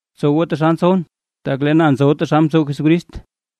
Btsow goo taxal ntsowʼn, tak lee na ntsowʼn taxal mtsow Jesucrist.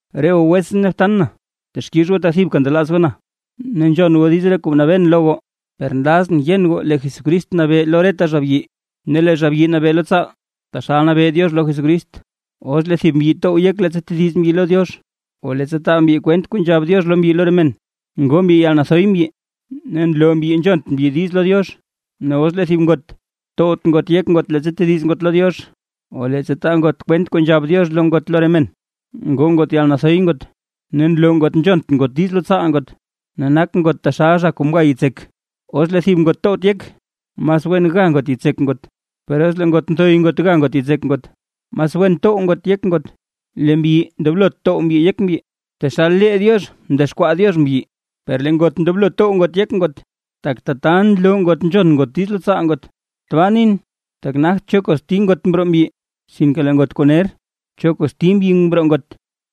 Re goo wetsʼn ne btan na texkix goo tak thibka ntelaaz goo na, ne nzhon goo diiz re kuu mnabeen lo goo. Per nlazʼn yen goo lee Jesucrist nabee lo reta zha byi, ne lee zha byi nabee lo tsaal, taxal nabee Diox lo Jesucrist. Os lee thib mbyi tow yek leettsa tediz mbyi lo Diox, o leettsa taa mbyi kwent kuu nzhab Diox lo mbyi lo re men, ngoo mbyi yalnathoy mbyi ne nloo mbyi nzhont mbyi diiz lo Diox. Ne os lee thib ngot towt ngot yek leettsa tediz ngot lo Diox, o leettsa taa ngot kwent kuu nzhab Diox lo ngot lo re men, ngoo ngot yalnathoy ngot ne nloo ngot nzhont ngot diiz lo tsaal ngot. Ne nak ngot taxal zha kuu mga yitsek. Os lee thib ngot towt yek, mas wen ga ngot yitsek ngot. Per os lee ngot nthoy ngot ga yitsek ngot, mas wen tow ngot yek ngot. Lee mbyi ndoblot tow mbyi yek mbyi, tak taxal lee Diox mdexkwaa Diox mbyi. Per lee ngot ndoblo tow ngot yek ngot, tak tata nloo ngot nzhon ngot diiz lo tsaal ngot. Tbaa nin, tak nagt cho kosti ngot mroo mbyi, sinke lee ngot kuu ner, cho kosti mbyi mroo ngot.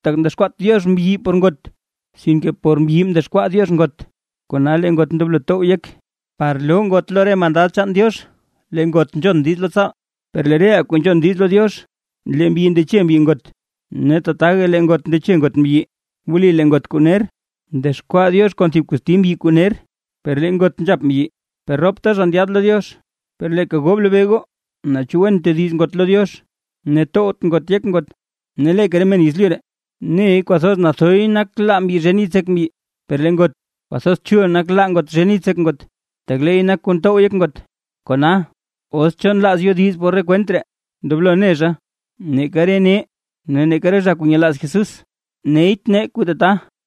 Tak mdexkwaat Diox mbyi por ngot, sinke por mbyi mdexkwaa Diox ngot. Kona lee ngot ndoblo tow yek, par loo ngot lo re mandad chaan Diox lee ngot nzhon diiz lo tsaal. Per lee reʼaa kuu nzhon diiz lo Diox, lee mbyi ndeche mbyi ngot, ne tataga lee ngot ndeche ngot mbyi. Wli lee ngot kuu ner mdexkwaa Diox kon thib kosti mbyi kuu ner, per lee ngot nzhap mbyi, per ropta zha ndyaad lo Diox. Per leeka goo blobee goo, naa chu wen tediz ngot lo Diox ne towt ngot yek ngot. Ne leeka re men yezlyu ree, ne kwathoz nathoy nak laa mbyi zhen yitsek mbyi, per lee ngot, kwathoz chul nak laa ngot zhen yitsek ngot, tak leey nak kuu ntow yek ngot. Kona, os cho nlaaz yodiz por re kwent ree: ndoblo ne zha, neeka re nee ne neeka re zha kuu nyelaaz Jesús neyt nee kuu tata.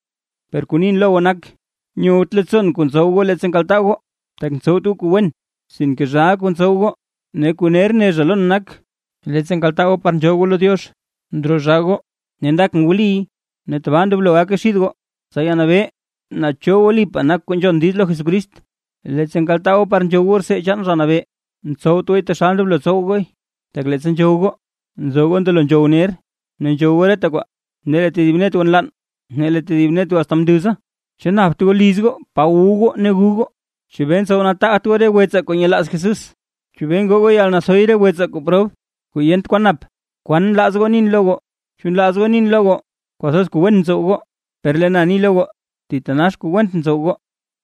Per kuu nin lo goo nal nak, nyowt leettsoon kuu ntsow goo leettsa nkaltaa goo, tak ntsowt goo kuu wen, sinke zhaaʼa kuu ntsow goo. Ne kuu ner ne zha lon nak, leettsa nkaltaa goo par nzhool goo lo Diox ndroo zhaa goo, ne ndakʼn wliy. Ne tabaa ndoblo gake xid goo, tsa yanabee naa cho wlipaa nak kuu nzhon diiz lo Jesucrist. Leettsa nkaltaa goo par nzhow goo rtsee chaan Zha Nabee, ntsowt gooy taxal ndoblo tsow gooy. Tak leettsa nzhow goo, nzo goo ndelo nzhow ner, ne nzhow goo reta kwaa, ne lee tedib net goo nlann, ne lee tedib net goo asta mnduza. ¿Chu napt goo liz goo pa wu goo ne gu goo? ¿Chebee ntsow nataagt goo re wetsaa kuu nyelaaz Jesús? ¿Chebee ngoo goo yalnathoy re wetsaa kuu prob kuu yent kwan nap? ¿Kwan nlaaz goo nin lo goo? ¿Chu nlaaz goo nin lo goo kwathoz wen kuu ntsow goo? Per lee na ni lo goo. ¡Thitanax went kuu ntsow goo!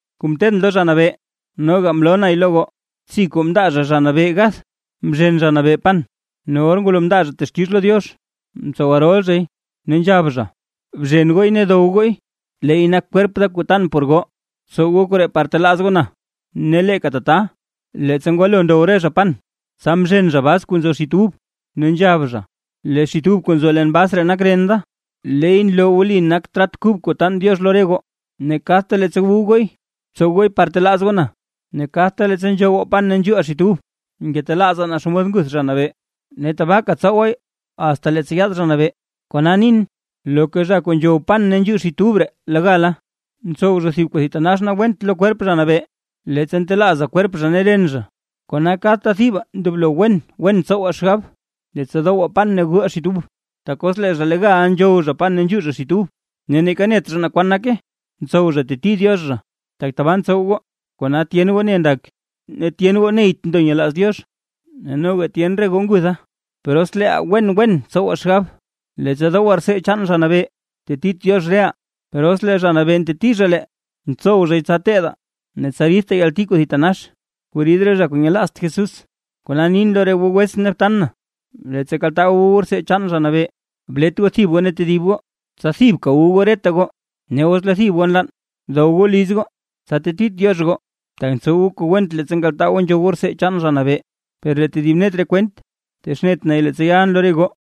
Kuu mteedʼn lo Zha Nabee noga mloo nay lo goo: Btsi kuu mndaa zha Zha Nabee gath, mzhen Zha Nabee pan, ne or ngwalo mndaa zha texkix lo Diox, mtsow rol zhay ne nzhab zha: “Bzhen gooy ne dow gooy. Leey nak kwerp da kuu tan por goo. Btsow goo koree par telaaz goo na.” Ne leeka tata, leettsa ngwalo ndow re zha pan, tsa mzhen zha bas kuu nzo xit ub, ne nzhab zha: “Lee xit ub kuu nzo leen bas ree nak ren da, ne leey nloo wli nak trat kub kuu taan Diox lo re goo. Ne kadta leettsa gu gooy, btsow gooy par telaaz goo na.” Ne kadta leettsa nzhowaa pan ne nzhuuʼaa xit ub, ngetelaazaa naa xomod nguth Zha Nabee. Ne tabaaka tsowaay asta leettsa yaad Zha Nabee. Kona nin, loka zha kuu nzhow pan ne nzhuu xit ub ree legal, ntsow zha thib kuu thitanax went lo kwerp Zha Nabee, leettsa ntelaazaa kwerp zha ne ren zha. Kona kadta thibaa ndoblo wen wen tsowaa xgab, leettsa dowaa pan ne guʼaa xit ub. Tak os lee zha legal nzhow zha pan ne nzhuu zha xit ub, ne neeka net zha na kwan nake, ntsow zha teti Diox zha. Tak tabaa ntsow goo, kona tyen goo ne ndak, ne tyen goo neyt ndo nyelaaz Diox, ne noga tyen re goo ngutha. Per os leeʼaa wen wen tsowaa xgab leettsa dowaa rtsee chaan Zha Nabee, tetit Diox reʼaa. Per os lee Zha Nabee nteti zha lee, ntsow zhay tsa teedaa ne tsa ridtaa yalti kuu thitanax kuu rid re zha kuu nyelaazt Jesús. Kona nin lo re goo wetsʼn ne btan na, leettsa kaltaa goo wu goo rtsee chaan Zha Nabee, blet goo thib goo ne tedib goo, tsa thibka wu goo reta goo. Ne os lee thib goo nlann, dow goo liz goo, tsa tetit Diox goo, tak ntsow goo kuu went leettsa nkaltaa goo nzhow goo rtsee chaan Zha Nabee. Lee tedib net re kwent texnet nay leettsa yalʼn lo re goo.